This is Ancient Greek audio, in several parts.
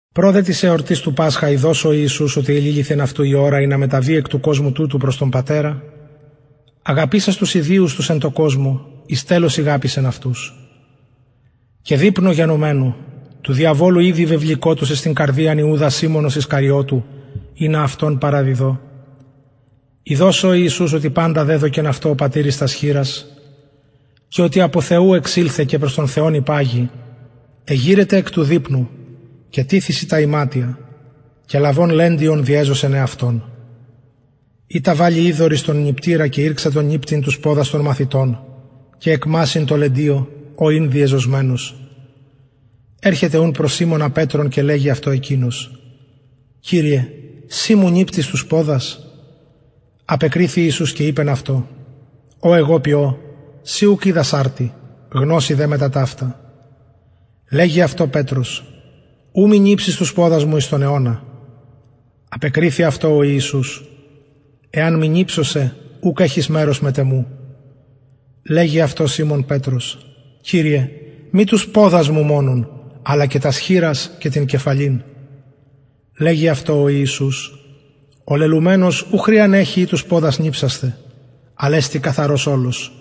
προ δε της εορτης του πασχα ειδως ο ιησους οτι εληλυθεν αυτου η ωρα ινα μεταβη εκ του κοσμου τουτου προς τον πατερα αγαπησας τους ιδιους τους εν τω κοσμω εις τελος ηγαπησεν αυτους και δειπνου γενομενου του διαβολου ηδη βεβληκοτος εις την καρδιαν ιουδα σιμωνος ισκαριωτου ινα αυτον παραδω ειδως ο ιησους οτι παντα δεδωκεν αυτω ο πατηρ εις τας χειρας και οτι απο θεου εξηλθεν και προς τον θεον υπαγει εγειρεται εκ του δειπνου και τιθησιν τα ιματια και λαβων λεντιον διεζωσεν εαυτον ειτα βαλλει υδωρ εις τον νιπτηρα και ηρξατο νιπτειν τους ποδας των μαθητων και εκμασσειν τω λεντιω ω ην διεζωσμενος ερχεται ουν προς σιμωνα πετρον και λεγει αυτω εκεινος κυριε συ μου νιπτεις τους ποδας απεκριθη ιησους και ειπεν αυτω ο εγω ποιω συ ουκ οιδας αρτι γνωση δε μετα ταυτα λεγει αυτω πετρος ου μη νιψης τους ποδας μου εις τον αιωνα απεκριθη αυτω ο ιησους εαν μη νιψω σε ουκ εχεις μερος μετ εμου λεγει αυτω σιμων πετρος κυριε μη τους ποδας μου μονον αλλα και τας χειρας και την κεφαλην λεγει αυτω ο ιησους ο λελουμενος ου χρειαν εχει η τους ποδας νιψασθαι αλλ εστιν καθαρος ολος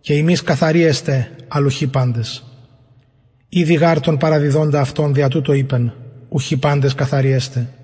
και υμεις καθαροι εστε αλλ ουχι παντες ηδει γαρ τον παραδιδοντα αυτον δια τουτο ειπεν ουχι παντες καθαροι εστε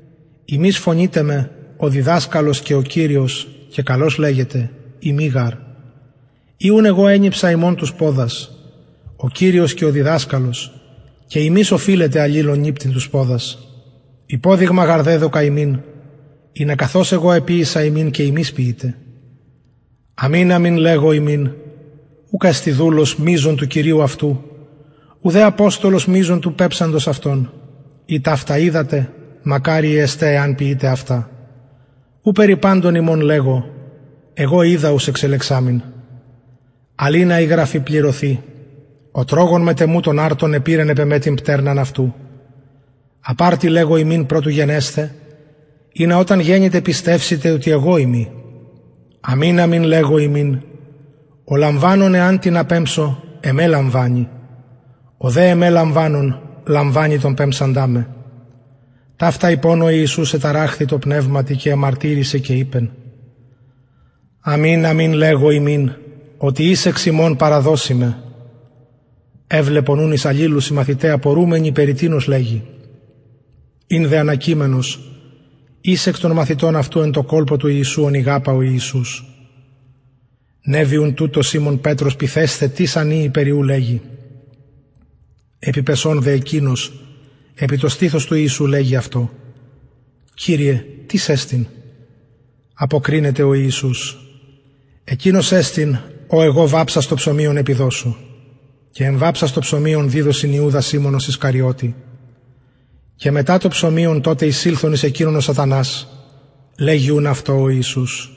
υμεις φωνειτε με ο διδασκαλος και ο κυριος και καλως λεγετε ειμι γαρ ει ουν εγω ενιψα υμων τους ποδας ο κυριος και ο διδασκαλος και υμεις οφειλετε αλληλων νιπτειν τους ποδας υποδειγμα γαρ εδωκα υμιν ινα καθως εγω εποιησα υμιν και υμεις ποιητε αμην αμην λεγω υμιν ουκ εστιν δουλος μειζων του κυριου αυτου ουδε αποστολος μειζων του πεμψαντος αυτον ει ταυτα οιδατε μακαριοι εστε εαν ποιητε αυτα ου περι παντων υμων λεγω εγω οιδα ους εξελεξαμην αλλ ινα η γραφη πληρωθη ο τρωγων μετ εμου τον αρτον επηρεν επ εμε την πτερναν αυτου απ αρτι λεγω υμιν προ του γενεσθαι ινα οταν γενηται πιστευσητε οτι εγω ειμι αμην αμην λεγω υμιν ο λαμβανων εαν τινα πεμψω εμε λαμβανει ο δε εμε λαμβανων λαμβανει τον πεμψαντα με ταυτα ειπων ο ιησους εταραχθη τω πνευματι και εμαρτυρησεν και ειπεν αμην αμην λεγω υμιν οτι εις εξ υμων παραδωσει με εβλεπον ουν εις αλληλους οι μαθηται απορουμενοι περι τινος λεγει ην δε ανακειμενος εις των μαθητων αυτου εν τω κολπω του ιησου ον ηγαπα ο ιησους νευει ουν τουτω σιμων πετρος πυθεσθαι τις αν ειη περι ου λεγει επιπεσων δε εκεινος ουτως επι το στηθος του ιησου λεγει αυτω κυριε τις εστιν αποκρινεται ο ιησους εκεινος εστιν ω εγω βαψας το ψωμιον επιδωσω και εμβαψας το ψωμιον διδωσιν ιουδα σιμωνος ισκαριωτη και μετα το ψωμιον τοτε εισηλθεν εις εκεινον ο σατανας λεγει ουν αυτω ο ιησους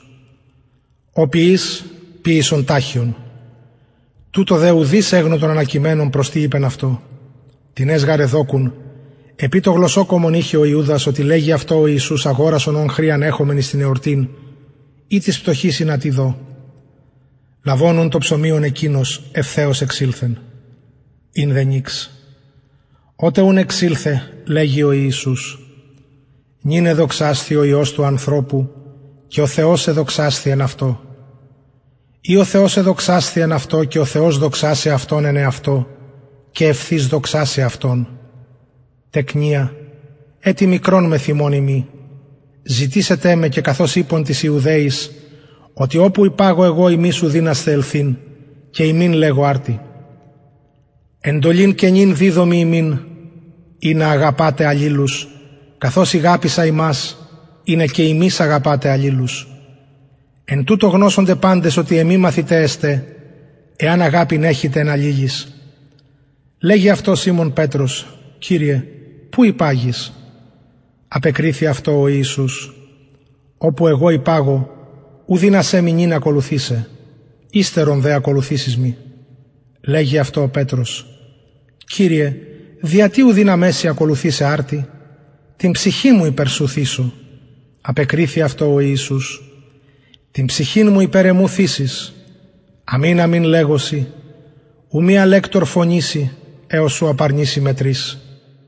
ο ποιεις ποιησον ταχιον τουτο δε ουδεις εγνω των ανακειμενων προς τι ειπεν αυτω τινες γαρ εδοκουν επει το γλωσσοκομον ειχεν ο ιουδας οτι λεγει αυτω ο ιησους αγορασον ων χρειαν εχομεν εις την εορτην η τοις πτωχοις ινα τι δω λαβων ουν το ψωμιον εκεινος ευθεως εξηλθεν ην δε νυξ οτε εξηλθεν λεγει ο ιησους νυν εδοξασθη ο υιος του ανθρωπου και ο θεος εδοξασθη εν αυτω ει ο θεος εδοξασθη εν αυτω και ο θεος δοξασει αυτον εν εαυτω και ευθυς δοξασει αυτον τεκνια ετι μικρον μεθ υμων ειμι ζητησετε με και καθως ειπον τοις ιουδαιοις οτι οπου υπαγω εγω υμεις ου δυνασθε ελθειν και υμιν λεγω αρτι εντολην καινην διδωμι υμιν ινα αγαπατε αλληλους καθως ηγαπησα υμας ινα και υμεις αγαπατε αλληλους εν τουτω γνωσονται παντες οτι εμοι μαθηται εστε εαν αγαπην εχητε εν αλληλοις λεγει αυτω σιμων πετρος κυριε που υπαγεις απεκριθη αυτω ο ιησους οπου υπαγω ου δυνασαι μοι νυν ακολουθησαι υστερον δε ακολουθησεις μοι λεγει αυτω πετρος κυριε δια τι ου δυναμαι σοι ακολουθησαι αρτι την ψυχην μου υπερ σου θησω απεκριθη αυτω ο ιησους την ψυχην σου υπερ εμου θησεις αμην αμην λεγω σοι ου μη αλεκτωρ φωνηση εως ου απαρνηση με τρις